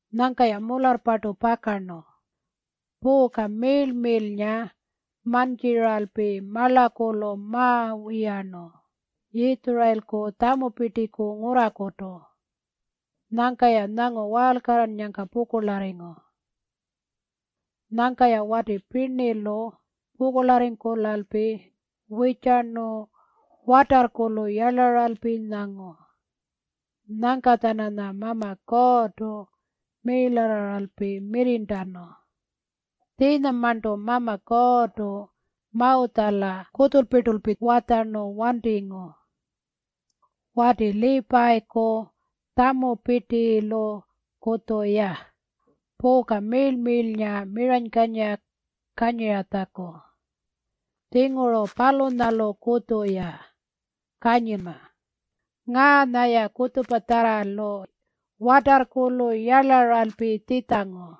Nyangka-ya mularrpartu pakarnu puuka miirl-miirlnga mantjiralpi marlakulu mawiyarnu Yitjurayilku tjamupirtiku ngurrakutu. Nyangka-ya nyangu waalkarrannyangka pukurlarringu. Nyangka-ya wati pirnilu pukurlarringkulalpi wirrtjarnu watarrkulu yarlaralpi nyangu. Nyangka-tjananya Mama Kuurrtu miirlarraralpi mirrirntanu. Tjiinyamarntu Mama Kuurrtu Mawutjala kutjulpirtulpi watjarnu wantingu wati Liipayiku tjamupirtilukutju-ya puuka miirl-miirlnga miranykanyira kanyiratjaku. Tjinguru palunyalukutju-ya kanyinma. Ngaanya-ya kutjupatjarralu watarrkulu yarlaralpi tjitjangu.